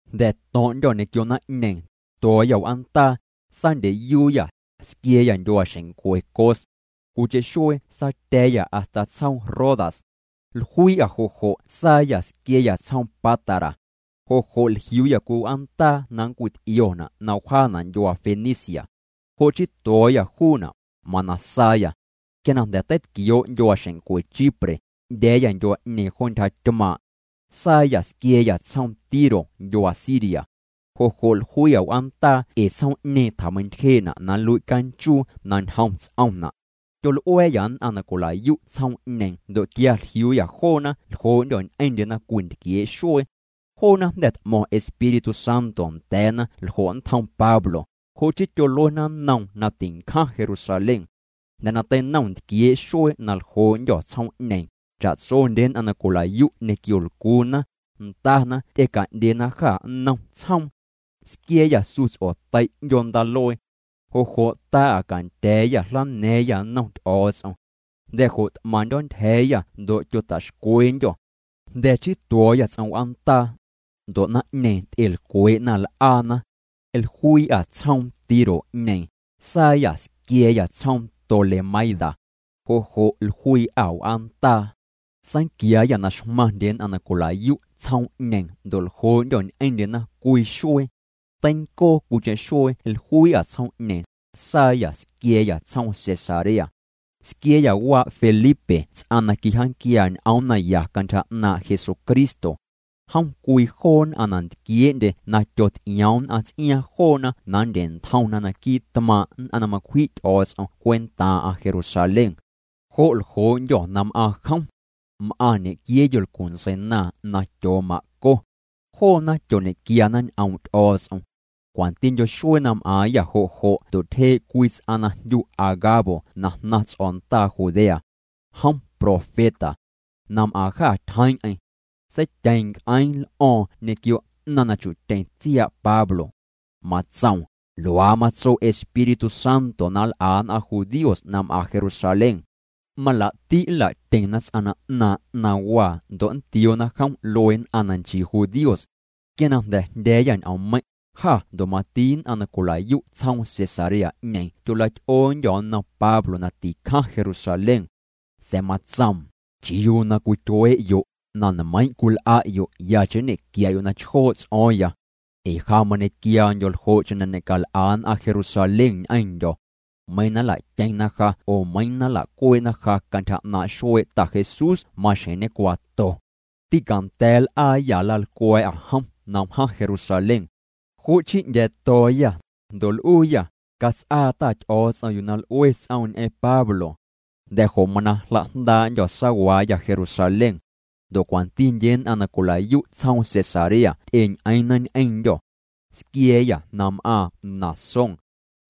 Jnda̱ to̱ⁿ'ndyô̱ ñequio naⁿ'ñeeⁿ, tuo̱o̱yâ w'aandaa, saandyeyuuyâ, squia̱a̱yâ ndyuaaxeⁿncwe Cos. Cwiicheⁿ xuee saatya̱a̱yâ hasta tsjoom Rodas. Jluii'â jo' jo' saayâ squia̱a̱yâ tsjoom Pátara. Jo' jo' jliuuyâ cwii w'aandaa na ncwit'iona' na wjaana' ndyuaa Fenicia. Jo' chii tuo̱o̱yâ juuna', mana saayâ. Quia na jnda̱ teitquioo' ndyuaaxeⁿncwe Chipre, 'ndya̱a̱yâ ndyuaa'ñeeⁿ jo ntyja tymaaⁿ'. Saayâ, squia̱a̱yâ tsjoom Tiro ndyuaa Siria. Jo' jo' jluii'â w'aandaa ee tsjoom'ñeeⁿ tjameintyjee'na' na nlui' canchuu na ñjom ts'omna'. Tyol'ua̱a̱yâ nn'aⁿ na cwila'yu' tsjoom'ñeeⁿ ndo' quia jliuuyâ joona ljoo'ndyô̱ ñ'eⁿndyena cwii ntquiee' xuee. Joona jnda̱ t'mo̱ⁿ Espíritu Santo nda̱a̱na ljo' nntjom Pablo, jo' chii tyoluena nnoom na tincjaⁿ Jerusalén. Jnda̱ na teinom ntquiee' xuee na ljoo'ndyô̱ tsjoom'ñeeⁿ, cha'tsondye nn'aⁿ na cwila'yu' ñequio lcuuna, ndana ty'eca'ndyena jâ nnom tsjoom. Squia̱a̱yâ su ts'otei' 'ndyoo ndaaluee. Jo' jo' taa'â cantya̱a̱yâ jlana̱a̱ⁿyâ nnom Ty'o̱o̱ts'om. Jnda̱ jo' t'maⁿndyo̱ ntyja̱a̱yâ ndo' tyota'xcweendyô. Jnda̱ chii tuo̱o̱yâ ts'om w'aandaa. Ndo' naⁿ'ñeeⁿ ty'elcwee'na l'aana. Jluii'â tsjoom Tiro'ñeeⁿ, saayâ squia̱a̱yâ tsjoom Tolemaida. Jo' jo' jluii'â w'aandaa. Saanquiaayâ na xmaⁿndye nn'aⁿ na cwila'yu' tsjoom'ñeeⁿ ndo' ljoo'ndyô̱ ñ'eⁿndyena cwii xuee. Teincoo cwiicheⁿ xuee jluii'â tsjoom'ñeeⁿ, saayâ squia̱a̱yâ tsjoom Cesarea. Squia̱a̱yâ waa' Felipe ts'aⁿ na quijaanquiaa ñ'oom naya cantyja 'naaⁿ' Jesucristo. Jom cwii joo nn'aⁿ na ntquiee'ndye na tyoty'ioom nn'aⁿ ts'iaaⁿ joona na nndye'ntjomna naquii' tmaaⁿ' nn'aⁿ na macwji' Ty'o̱o̱ts'om cwentaaⁿ'aⁿ Jerusalén. Jo' ljoo'ndyô̱ na m'aaⁿ jom. M'aⁿ ñequiee yolcu ntseinaaⁿ na tyooma'co. Joona tyoñequiana ñ'oom' Ty'o̱o̱ts'om. Cwantindyo xuee na m'aaⁿyâ jo' jo' ndo' tyjee' cwii ts'aⁿ na jndyu Agabo na jnaⁿ ts'o̱ndaa Judea. Jom profeta. Na m'aaⁿ jâ tyjeeⁿ'eⁿ. Seityeeⁿ nc'eeⁿ l'o̱o̱ⁿ ñequio 'naⁿ na chu'tyeⁿ tsiaa' Pablo. Matsoom: —Luaa matso Espíritu Santo na nl'a nn'aⁿ judíos na m'aⁿ Jerusalén. Malaa'ti' nla'tyeⁿna ts'aⁿ na 'naaⁿ' 'naⁿwaa ndo' nntioona jom luee nn'aⁿ na nchii nn'aⁿ judíos. Quia na jndya̱a̱yâ ñ'oommeiⁿ', jâ ndo' mati nn'aⁿ na cwila'yu' tsjoom Cesarea'ñeeⁿ tyola'ty'oondyô̱ nnom Pablo na ticjaⁿ Jerusalén. Sa̱a̱ matsoom: —¿Chiuu na cwityuee'yo'? Na nmeiiⁿ' cwil'a'yo' yacheⁿ nñe'quia'yo' na chjoo' ts'o̱o̱ⁿya. Ee ja mañequiaandyo̱ ljo'cheⁿ na ñe'cal'a nn'aⁿ Jerusalén ñ'eⁿndyo̱. Meiiⁿ na nlatyeⁿna ja oo meiiⁿ na nlacuee'na ja cantyja 'naaⁿ' xuee' Ta Jesús maxjeⁿ ñecuaato. Tîcanda̱a̱ nl'aayâ nlalcwa̱a̱'â jom na wjaⁿ Jerusalén. Jo' chii 'ndya̱a̱to̱o̱yâ, ndo' l'uuyâ: —Cats'aa Ta Ty'o̱o̱ts'om yuu na l'ue ts'oom ñ'eⁿ Pablo. Jnda̱ jo' mana jla'jndaa'ndyô̱ saawaayâ Jerusalén. Ndo' cwantindye nn'aⁿ na cwila'yu' tsjoom Cesarea ty'eñ'eeⁿna ñ'eⁿndyô̱. Squia̱a̱yâ na m'aaⁿ Mnasón.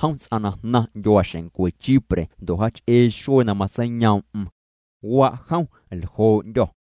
Jom ts'aⁿ na jnaⁿ ndyuaaxeⁿncwe Chipre ndo' jaach'ee xuee na matseiyoom'm. Waa' jom ljoo'ndyô̱.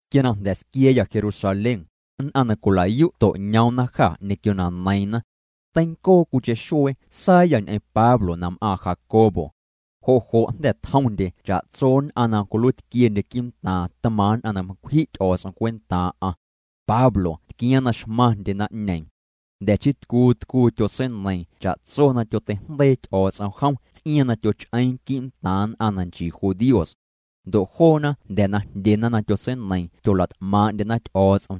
Quia na jnda̱ squia̱a̱yâ Jerusalén, nn'aⁿ na cwila'yu' to'ñoomna jâ ñequio na neiiⁿna. Teincoo cwiicheⁿ xuee saayâ ñ'eⁿ Pablo na m'aaⁿ Jacobo. Jo' jo' jnda̱ tjomndye cha'tso nn'aⁿ na cwiluiitquiendye quii'ntaaⁿ tmaaⁿ' nn'aⁿ na macwji' Ty'o̱o̱ts'om cwentaaⁿ'aⁿ. Pablo tquiaaⁿ na xmaⁿndye naⁿ'ñeeⁿ. Jnda̱ chii tcuu tcuu tyotseineiiⁿ cha'tso na tyoteijndeii Ty'o̱o̱ts'om jom ts'iaaⁿ na tyoch'eeⁿ quii'ntaaⁿ nn'aⁿ na nchii judíos. Ndo' joona jnda̱ na jndyena na tyotseineiiⁿ tyola't'maaⁿ'ndyena Ty'o̱o̱ts'om.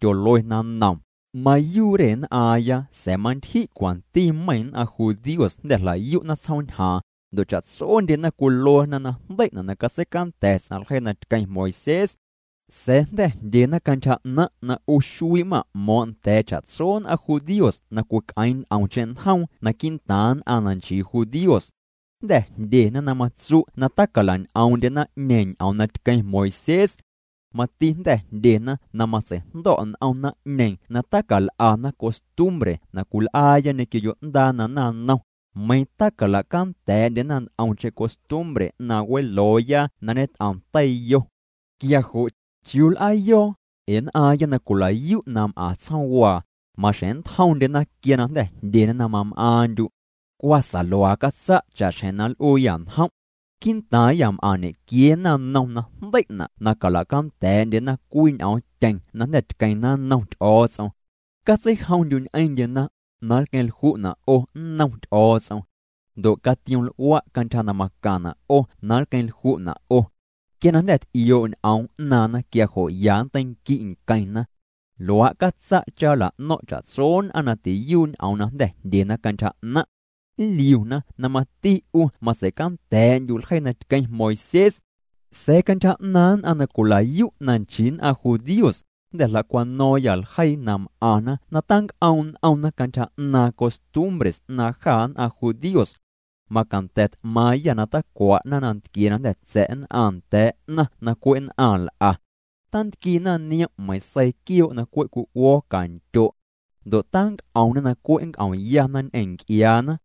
Tyoluena nnoom: —Mayuu' re nn'aaⁿya sa̱a̱ mantyji' cwanti meiⁿ nn'aⁿ judíos jnda̱ jla'yu'na tsjoom ñjaaⁿ, ndo' cha'tsondyena cwiluena na jndei'na' na catseicanda̱ ts'aⁿ ljeii na tqueⁿ Moisés. Sa̱a̱ jnda̱ jndyena cantyja 'naⁿ' na 'u xuii' ma'mo̱o̱ⁿ' nda̱a̱ cha'tso nn'aⁿ judíos na cwic'eeⁿ nt'omcheⁿ njoom naquii' ntaaⁿ nn'aⁿ na nchii judíos. Jnda̱ jndyena na matsu' na tacalan'oom'ndye naⁿ'ñeeⁿ ñ'oom na tqueⁿ Moisés. Mati jnda̱ jndyena na matseijndo̱' n'om naⁿ'ñeeⁿ na tacal'ana costumbre na cwil'aaya ñequio yo'ndaa na naⁿnom, meiⁿ tacalacanda̱a̱'ndyena nt'omcheⁿ costumbre 'naaⁿ welooya na ñet'om teiyo. Quia jo' ¿chiuu ya nl'aayo̱o̱ya? Ee nn'aaⁿya na cwila'yu' na m'aⁿ tsjoomwaa, maxjeⁿ nntjomndyena quia na jnda̱ jndyena na mam'aaⁿndyu'. Cwa sa luaa catsa' cha'xjeⁿ na nl'uuyâ njom'. Quii'ntaaⁿyâ m'aⁿ ñequiee naⁿnom na jndei'na' na cala'canda̱a̱'ndyena cwii ñ'oomtyeⁿ na jnda̱ tqueⁿna nnom Ty'o̱o̱ts'om. Catseijomndyu' ñ'eⁿndyena, na nlqueⁿ lju'na' 'o nnom Ty'o̱o̱ts'om. Ndo' catiom'l'ua' cantyja na macaⁿna' 'o na nlqueⁿlju'na' 'o. Quia na jnda̱ t'ioo' ñ'oom 'naaⁿna quia jo' ya nnteinqui' nqueⁿna. Luaa' catsa' cha nla'no̱ⁿ' cha'tso nn'aⁿ na tiyuu' ñ'oom na jnda̱ jndyena cantyja 'naⁿ'. Nliuna na mati 'u matseicanda̱a̱'ndyu' ljeii na tqueⁿ Moisés. Sa̱a̱ cantyja 'naaⁿ nn'aⁿ na cwila'yu' na nchii nn'aⁿ judíos, jnda̱ jla'cwano̱o̱ⁿyâ ljeii na m'aⁿna na tanc'oom' n'omna cantyja 'naaⁿ costumbre 'naaⁿ jâ nn'aⁿ judíos. Macanda̱ t'maaⁿyâ na tacwa'na nantquie na jnda̱ tsa̱' nn'aⁿ nda̱a̱ 'naⁿ na cwe' nn'aⁿ nl'a. Tantquiina niom' meiⁿ seii quioo' na cwe' cwi'uo̱o̱ cantyo'. Ndo' tanc'omna na cwe' nnc'omyana ñ'eⁿ nc'iaana.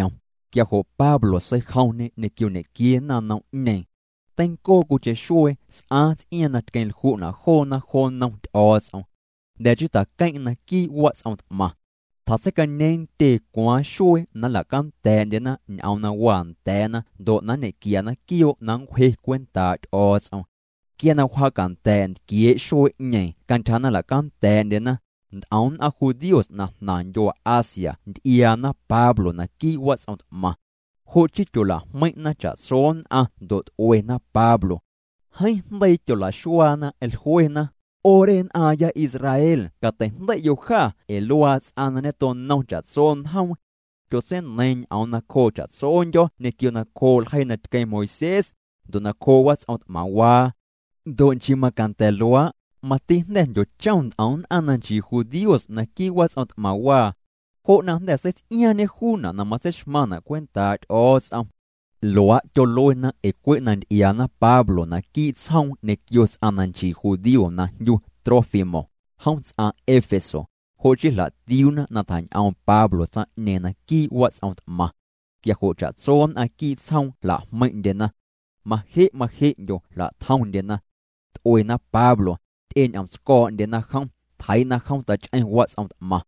Quia jo' Pablo seijomñê ñequio ñequiee naⁿnom'ñeeⁿ. Teincoo cwiicheⁿ xuee s'aaⁿ ts'iaaⁿ na tqueⁿ lju'na' joona jo nnom Ty'o̱o̱ts'om. Jnda̱ chii tjaqueⁿ'eⁿ naquii' wats'om t'maⁿ. Tjatseicañeeⁿ ntyee cwaaⁿ xuee na nla'canda̱a̱'ndyena ñ'oom na waa nda̱a̱na ndo' na nñequiana quioo' na nncwje cwentaa' Ty'o̱o̱ts'om. Quia na wjaacanda̱a̱' ntquiee' xuee'ñeeⁿ cantyja na nla'canda̱a̱'ndyena, nt'om nn'aⁿ judíos na jnaⁿ ndyuaa Asia nty'iaana Pablo naquii' wats'om t'maⁿ. Jo' chii tyola'jmeiⁿ'na cha'tso nn'aⁿ ndo' t'uena Pablo. Jeeⁿ jndeii tyola'xuaana jluena: —'O re nn'aaⁿya Israel catei'jndei'yo' jâ ee luaa ts'aⁿ na ñetonom cha'tso njoom. Tyotseineiiⁿ ñ'oom nacjoo cha'tsondyo̱ ñequio nacjoo' ljeii na tqueⁿ Moisés, ndo' nacjoo' wats'om t'maⁿwaa. Ndo' nchii macanda̱ luaa', mati jnda̱ jndyochom nt'om nn'aⁿ na nchii judíos naquii' wats'om t'maⁿwaa. Jo' na jnda̱ seits'iaaⁿñê juuna' na matseixmaⁿna' cwentaa' Ty'o̱o̱ts'om. Luaa' tyoluena ee cwe' na nty'iaana Pablo naquii' tsjoom ñequio ts'aⁿ na nchii judío na jndyu Trófimo, jom ts'aⁿ Éfeso, jo' chii jla'tiuuna na tjañ'oom Pablo tsaⁿ'ñeeⁿ naquii' wats'om t'maⁿ. Quia jo' cha'tso nn'aⁿ quii' tsjoom jla'jmeiⁿ'ndyena. Maje' maje'ndyo jla'tjomndyena. T'uena Pablo, ty'eñ'omtsco̱o̱'ndyena jom, tjeii'na jom tach'eⁿ wats'om t'maⁿ.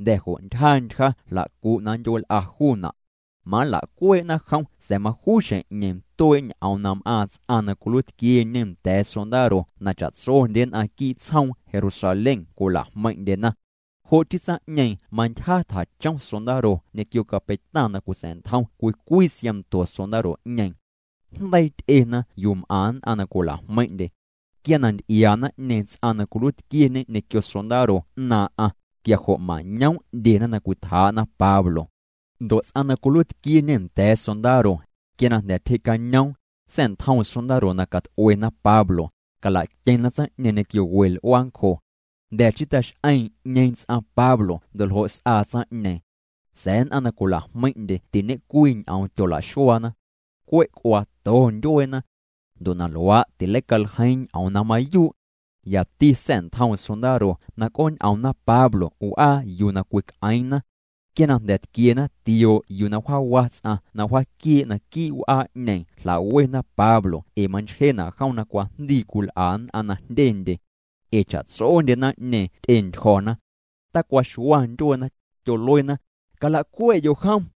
Jnda̱ jo' ntyja ntyja jla'cu'na ndyueel'a juuna'. Manla'cuee'na jom sa̱a̱ majuu xjeⁿ'ñeeⁿ tuee' ñ'oom na m'aaⁿ ts'aⁿ na cwiluiitquieñe nda̱a̱ sondaro na cha'tsondye nn'aⁿ quii' tsjoom Jerusalén cwila'jmeiⁿ'ndyena. Jo' chii tsaⁿ'ñeeⁿ mantyja tjachom sondaro ñequio capeitaⁿ na cwitsa̱'ntjom cwii cwii siaⁿnto sondaro'ñeeⁿ. Jndeii ty'ena yuu m'aⁿ nn'aⁿ na cwila'jmeiⁿ'ndye. Quia na nty'iaa naⁿ'ñeeⁿ ts'aⁿ na cwiluiitquieñe ñequio sondaro 'naaⁿ'aⁿ, quia jo' mañoom' 'ndyena na cwitjaa'na Pablo. Ndo' ts'aⁿ na cwiluiitquieñe nda̱a̱ sondaro, quia na jnda̱ tyjee'cañoom, sa̱'ntjoom sondaro na cat'uena Pablo, cala'tyeⁿna tsaⁿ'ñeeⁿ ñequio we l'uaancjo. Jnda̱ chii tax'eeⁿ 'ñeeⁿ ts'aⁿ Pablo ndo' ljo' s'aa tsaⁿ'ñeeⁿ. Sa̱a̱ nn'aⁿ na cwila'jmeiⁿ'ndye tiñe'cwii ñ'oom tyola'xuaana. Cwe' c'uaato ndyueena. Ndo' na luaa' tileicaljeiiⁿ ñ'oom na mayuu'. Yati sa̱'ntjoom sondaro na c'ooñ'omna Pablo w'aa yuu na cwic'eeⁿna. Quia na jnda̱ tquiena tioo' yuu na jaawa ts'aⁿ na wjaaquiee' naquii' w'aa'ñeeⁿ jla'wena Pablo ee manchjena' jom na cwajndii cwil'a nn'aⁿ na jndyendye. Ee cha'tsondye naⁿ'ñeeⁿ ty'entyjo̱na. Tacwaxua ndyueena, tyoluena: —Calacue'yo' jom.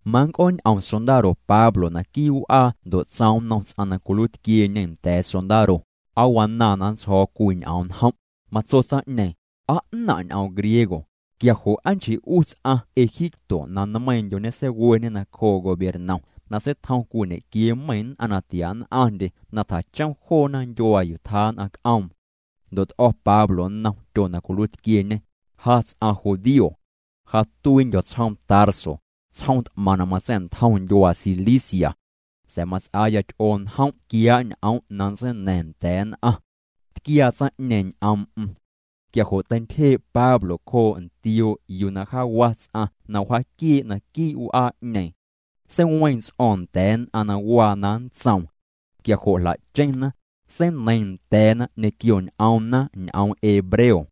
Mannc'ooñ'om sondaro Pablo naquii' w'aa ndo' tsoom nnom ts'aⁿ na cwiluiitquieñe nda̱a̱ sondaro: —¿Aa wanaaⁿ na nntsjo̱o̱ cwii ñ'oom njom'? Matso tsaⁿ'ñeeⁿ: —¿Aa 'naⁿ' ñ'oom griego? Quia jo' aa nchii ts'aⁿ egipto 'u na nmeiiⁿndyo ñeseiweñe nacjoo' gobiernom na seitjoom cwii ñequiee meiⁿ nn'aⁿ na tia nn'aⁿndye na tjachom joona ndyuaa yuu tjaa nn'aⁿ c'oom. Ndo' t'o̱ Pablo nnom tyo na cwiluiitquieñe: —Ja ts'aⁿ judío. Ja tuiindyo̱ tsjoom Tarso, tsjoom t'maⁿ na matsa̱'ntjom ndyuaa Cilicia. Sa̱a̱ mats'aaya ty'oo njom' quiaa' ñ'om' na nntseina̱ⁿ nda̱a̱ nn'aⁿ. Tquiaa tsaⁿ'ñeeⁿ ñ'oom'm. Quia jo' teintyjee' Pablo cjoo' ntioo' yuu na jaawa ts'aⁿ na wjaaquiee' naquii' w'aa'ñeeⁿ. Seiweeⁿ ts'o̱o̱ⁿ nda̱a̱ nn'aⁿ na waa na nntsoom. Quia jo' jla'cheⁿna, seineiiⁿ nda̱a̱na ñequio ñ'oomna ñ'oom hebreo.